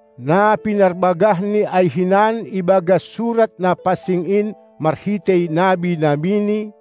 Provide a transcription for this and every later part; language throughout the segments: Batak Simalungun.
na pinarbagahNi ai hinan ibagas Surat na pansing in marhitei nabi-nabiNi,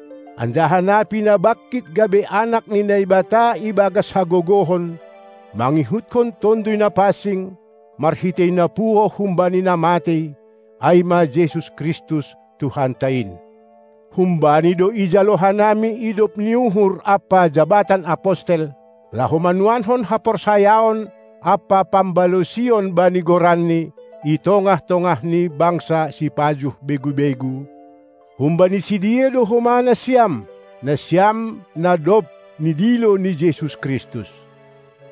anjaha na pinabangkit gabe Anak ni Naibata ibagas hagogohon, mangihutkon Tonduy Na pansing, marhitei na puho humbani na matei, ai ma Jesus Kristus, Tuhanta in. Hum-Bani do ijalo hanami idop ni uhur ampa jabatan apostel, laho manuankon haporsayaon ampa pambalosion bani goranNi, i tongah-tongah ni bangsa sipajuh begu-begu, humbani sidea do homa nasiam, nasiam na dob nidilo ni Jesus Kristus.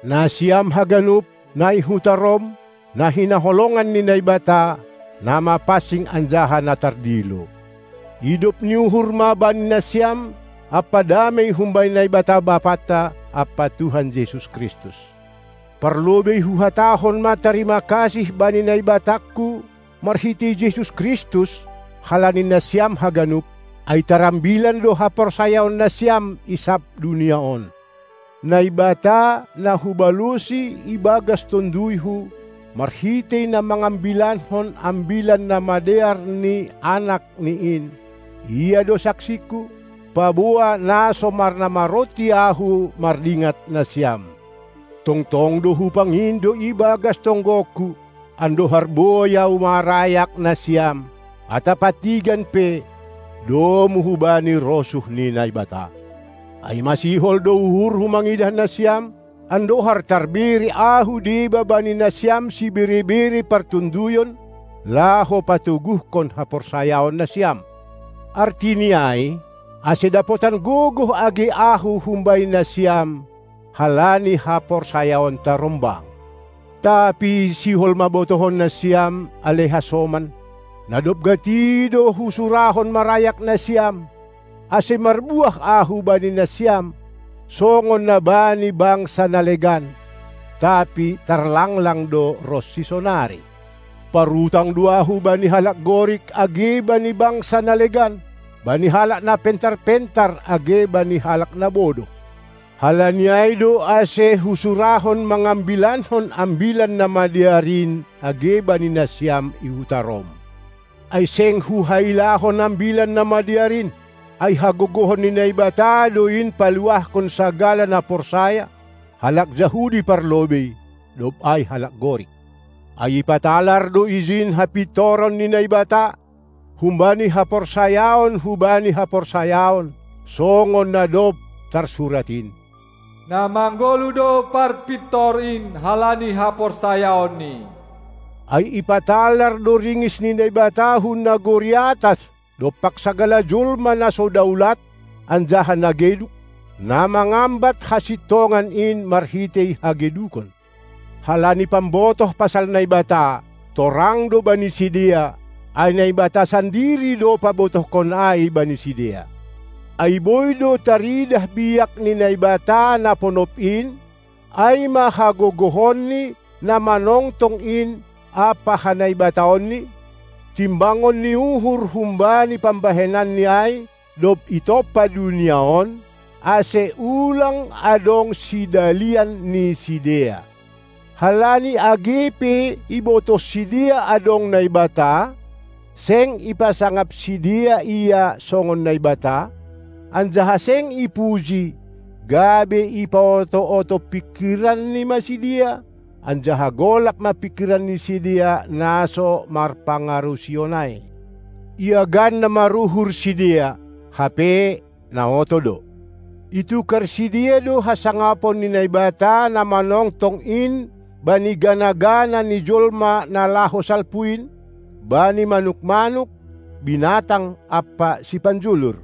Nasiam haganup, na i huta Rom, na hinaholongan ni Naibata, na mapansing anjaha na tardilo: Idop ni uhur ma bani nasiam ampa damei humbani Naibata Bapanta ampa Tuhan Jesus Kristus! Parlobei huhatahon ma tarima kasih bani Naibatangku marhitei Jesus Kristus halani nasiam haganup, ai tarambilan do haporsayaonnasiam i sab dunia on. Naibata, na hubalosi ibagas tonduyhu marhitei na mangambilankon Ambilan Namadear ni AnakNi in, Ia do saksingku, paboa na so marnamaronti ahu mardingat nasiam. Tongtong do hupangindo ibagas tonggongku, andohar boi ahu marayak nasiam, atap antigan pe, domu hubani rosuh ni Naibata. Ai masihol do uhurhu mangidah nasiam, andohar tarbere ahu deba bani nasiam sibere-bere partonduyon, laho patoguhkon haporsayaonnasiam, artini ai, ase dapotan gogoh age ahu humbani nasiam halani haporsayaonta rombang. Tapi sihol ma botohonnasiam, ale hasoman, na dob gati do husurahon marayak nasiam, ase marbuah ahu bani nasiam songon na bani bangsa na legan, tapi tarlanglang do ronsi sonari. Parutang do ahu bani halak Gorik age bani bangsa na legan, bani halak na pentar-pentar age bani halak na bodoh, halani ai do ase husurahon mangambilankon Ambilan Namadear in age bani nasiam i huta Rom. Ai seng huhailahon Ambilan Namadear in, ai hagogohon ni Naibata do in paluahkon sagala na porsaya, halak Jahudi parlobei, dob ai halak Gorik. Ai ipatalar do ijin hapintoron ni Naibata, humbani haporsayaon hubani haporsayaon, songon na dob tarsurat in: Na manggoluh do parpintor in halani haporsayaonni. Ai ipatalar do ringis ni Naibata hun nagori atas dompak sagala jolma na so daulat anjaha na geduk, na mangambat hasintongan in marhitei hagedukon. Halani pambotoh pasal Naibata, torang do bani sidea, ai Naibata sandiri do pabotohkon ai bani sidea. Ai boi do taridah biak ni Naibata na ponop in, ai ma hagogohonNi na manongtong in ampa hanaibataonNi, timbangon ni uhur humbani pambahenanNi ai, dob itompa dunia on, ase ulang adong sidalian ni sidea. Halani age pe ibotoh sidea adong Naibata, seng ipasangap sidea Ia songon Naibata, anjaha seng ipuji, gabe ipaoto-oto pingkiranni ma sidea, anjaha golap ma pingkiran ni sidea na so marpangarusion ai. Iagan na maruhur sidea, hape na oto do. Itukar sidea do hasangapon ni Naibata na manongtong in bani gana-gana ni jolma na laho salpu in, bani manuk-manuk, binatang ampa sipanjulur.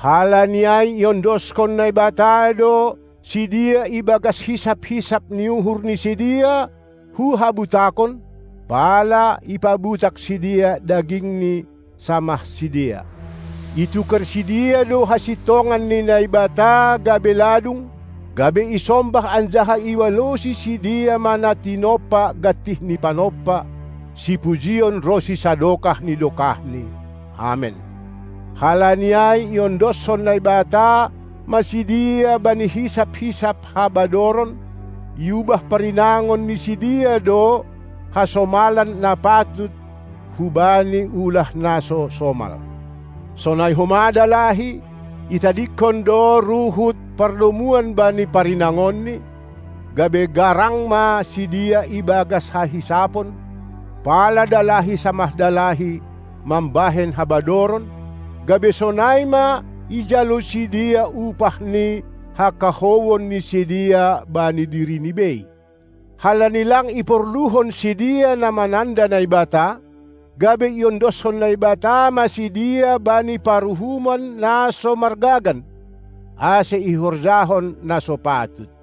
Halani ai iondoskon Naibata do sidea ibagas hisap-hisap ni uhur ni sidea hu habutakon, pala ipabutak sidea dagingni samah sidea. Itukar sidea do hasintongan ni Naibata gabe ladung, gabe isombah anjaha ibalosi sidea ma na tinompa gantih ni Panompa, sipujion ronsi sadokah ni dokahni. Amen. Halani ai iondoskon Naibata ma sidea bani hisap-hisap habadoron; iubah parinangon ni sidea do hasomalan na patut hubani ulah na so somal. Sonai homa dalahi, itadingkon do ruhut pardomuan bani parinangonni, gabe garang ma sidea ibagas hahisapon, pala dalahi samah dalahi mambahen habadoron, gabe sonai ma ijalo sidea upah ni hakahouon ni sidea bani dirini bei. Halani lang iporluhon sidea na mananda Naibata, gabe iondoskon Naibata ma sidea bani paruhumon na so margagan, ase ihorjahon na so patut.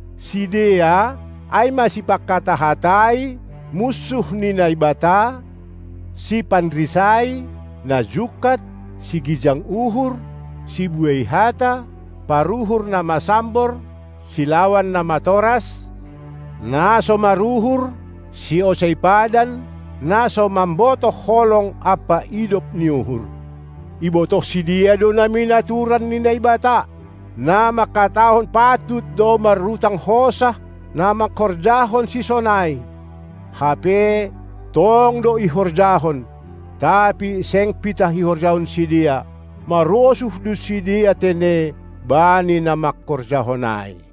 Sidea, ai ma sipanghata-hatai, munsuh ni Naibata, sipanrisai, na jungkat, sigijang uhur, sibuei hata, paruhur na masambor, silawan na matoras, na so maruhur, siosei padan, na so mambotoh holong ampa idop ni uhur. Ibotoh sidea do namin aturan ni Naibata, na mangkatahon patut do marutang hosah na mangkorjahon sisonai, hape tong do ihorjahon, tapi seng pitah ihorjahon sidea, marosuh do sidea tene bani na mangkorjahon ai.